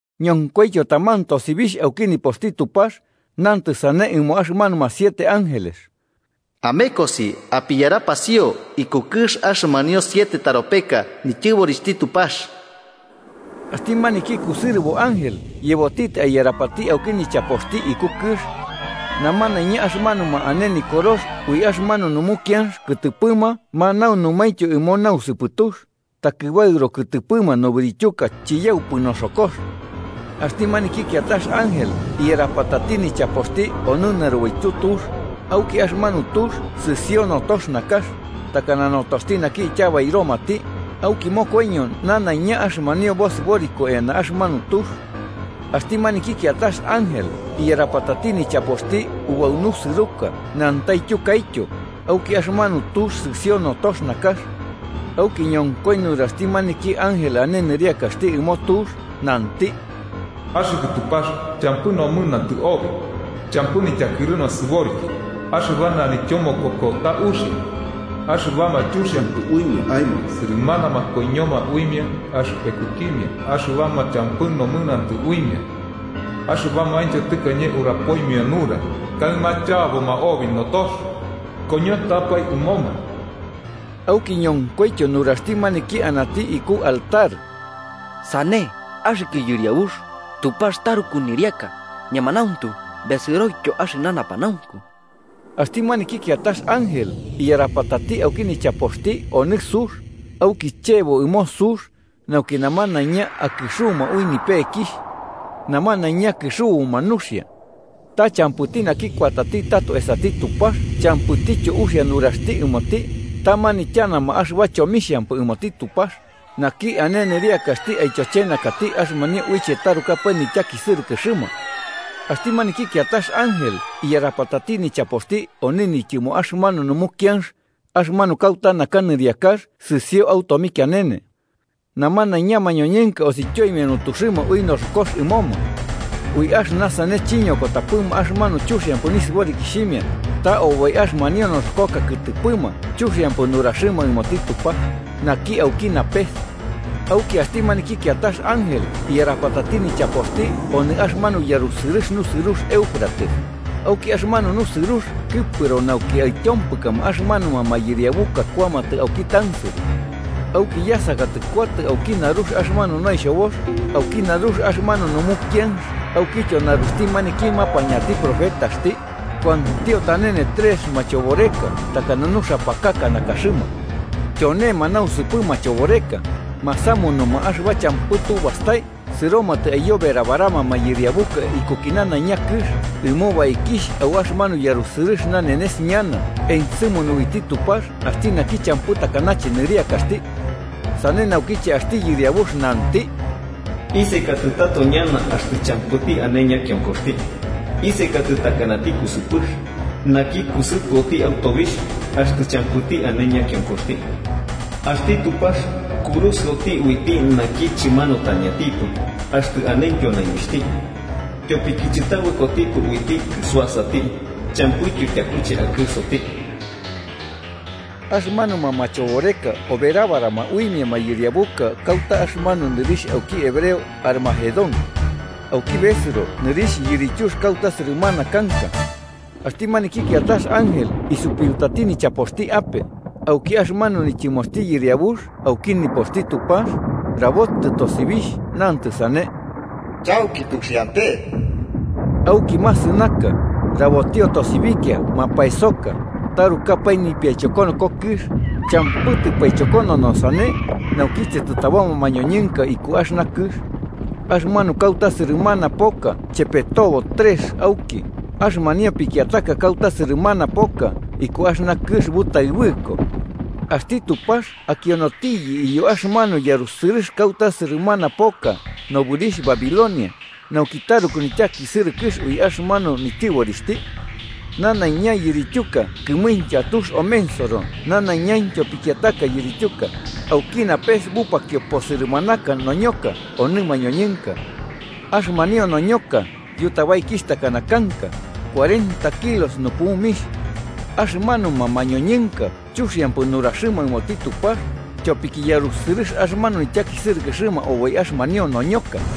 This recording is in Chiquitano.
Ñonkoityo taman tosibixh, auki nipoxti Tupax, nantɨ sane ɨmo axɨmanuma siete ángeles: “Amekosi apiyarapasio iku kɨx axɨmanio siete taropeka nityɨborixhti Tupax.” Axti maniki kusɨrɨbo ángel yebotitɨ aiyarapati auki nichapoxti iku kɨx. Namanaiña axɨmanuma ane nikorox ui axɨmanu numukianx kɨtɨpɨma manaunumaintyo ɨmo nausɨpɨtux, takɨbaɨro kɨtɨpɨma nobɨrityuka chiyaupɨ noboxokox. Axti maniki kiatax ángel iyarapatati nichapoxti onɨ narubaityu tux, auki axɨmanu tux sɨsio notox nakax, takana notoxti naki ityabairomati, auki mokoiño nanaiña axɨmanio bosɨboriko eana axɨmanu tux. Axti maniki kiatax ángel iyarapatati nichapoxti ubau nusɨruka autyo nantaityuka, auki axɨmanu tux sɨsio notox nakax. Auki ñonkoi nuraxti maniki ángel ane nɨriakaxti ɨmo tux, nanti: “Axɨkɨ Tupax, champɨ nomɨnantɨ obi, champɨ nityakɨru nasɨboriki, axɨba nanityomokoko ta uxia. Axɨbama chuxiampɨ uimia aemo sɨrɨmanama koiñoma uimia axɨpekukimia axɨbama champɨ nomɨnantɨ uimia, axɨbamaintyo tɨkañe urapoimia nura, kaɨma chaboma obi notox. ¡Koñotɨapae ɨmoma!” Auki ñonkoityo nuraxti maniki anati iku altar: “Sane, axɨkɨ Yɨriabux, Tupax taruku nɨriaka, ñemanauntu besɨroityo axɨna napanaunku.” Axti maniki kiatax ángel iyarapatati auki nichapoxti onɨ sux, auki chebo ɨmo sux nauki namanaiña akɨxuma ui nipekixh. Namanaiña kɨxubuma nuxia. Ta champɨti naki kuatati tato esati Tupax champɨtityo uxia nuraxti ɨmoti, ta manityanama axɨba chomixhampɨ ɨmoti Tupax, naki ane nɨriakaxti aityochenakati axɨmanio uiche tarukapae nityakisɨrɨkɨxɨma. Axti maniki kiatax ángel iyarapatati nichapoxti onɨ nityɨmo axɨmanu numukianx, axɨmanu kauta naka nɨriakax sɨsio au tomikianene. Namanaiña mañoñɨnka osityoimia nutuxɨma ui noxokox ɨmoma. Ui axɨna sane chiñokotapɨma axɨmanu chuxiampɨ nisɨborikixhimia, ta oboi axɨmanio noxokoka kɨtɨpɨma chuxiampɨ nuraxɨma ɨmoti Tupax, naki auki napes. Auki axti maniki kiatax ángel iyarapatati nichapoxti onɨ axɨmanu yarusɨrɨx nusɨrux Éufrates, auki axɨmanu nusɨrux kɨpɨro nauki aityompɨkama axɨmanuma mayɨriabuka kuamatɨ auki tansɨrɨ. Auki yasakatɨ kuatɨ auki narux axɨmanu noixhobox, auki narux axɨmanu numukianx aukityo naruxti maniki mapañati profetati, kuantio tanene trex machoboreka takana nuxapakaka nakaxɨma. Tyonema nausɨpɨ machoboreka, masamunuma axɨba champɨ tu bastai sɨromatɨ aiyoberabarama mayɨriabuka ikuki nanaiña kɨx ɨmo baikixh au axɨmanu yarusɨrɨx nanenes ñana ensɨmunu uiti Tupax axti naki champɨ takanache nɨriakaxti. Sane naukiche axti Yɨriabux nanti: “Isekatato ñana axtɨ champɨti ane ñakionkoxti. Isekatɨ takanati kusɨpɨx, naki kusɨpɨoti au tobixh axtɨ champɨti ane ñakionkoxti. Axti Tupax kurusɨoti uiti naki chɨmanutañatipɨ axtɨ anentyo naibixhti, tyopiki chɨtabɨkotipɨ uiti kɨsuasati. Champɨityo tyakuche akɨsoti.” Axɨmanuma machoboreka oberabarama uimia mayɨriabuka kauta axɨmanu nɨrixh auki hebreo Harmagedón. (auki besɨro nɨrixh yirityux kauta sɨrɨmana kanka) Axti maniki kiatax ángel isupiutati nichapoxti ape, auki axɨmanu nityɨmoxti Yɨriabux auki nipoxti Tupax rabotɨ tosibixh nantɨ sane: “¡Chauki tuxiante!” Auki masɨnaka, rabotio tosibikia mapaesoka, tarukapae nipiaichokonoko kɨx, champɨ tɨpaichokonono sane naukiche tɨtaboma mañoñɨnka iku axɨna kɨx. Axɨmanu kauta sɨrɨmana poka chepetobo trex auki, axɨmanio pikiataka kauta sɨrɨmana poka iku axɨna kɨx butaɨbɨko. Axti Tupax akionotiyɨ iyo axɨmanu yarusɨrɨx kauta sɨrɨmana poka nɨrixh Babilonia, nauki taruku nityakisɨrɨkɨx ui axɨmanu nityɨborixhti. Nanaiña yirityuka kɨmuintya tux omensoro nanaiñaintyo pikiataka yirityuka, auki napes bupakio posɨrɨmanaka noñoka onɨ mañoñɨnka. Axɨmanio noñoka niyutabaikixh takana kanka, cuarenta kilos nupumixh. Axɨmanuma mañoñɨnka chuxiampɨ nuraxɨma ɨmoti Tupax, tyopiki yarusɨrɨx axɨmanu nityakisɨrɨkɨxɨma oboi axɨmanio noñoka.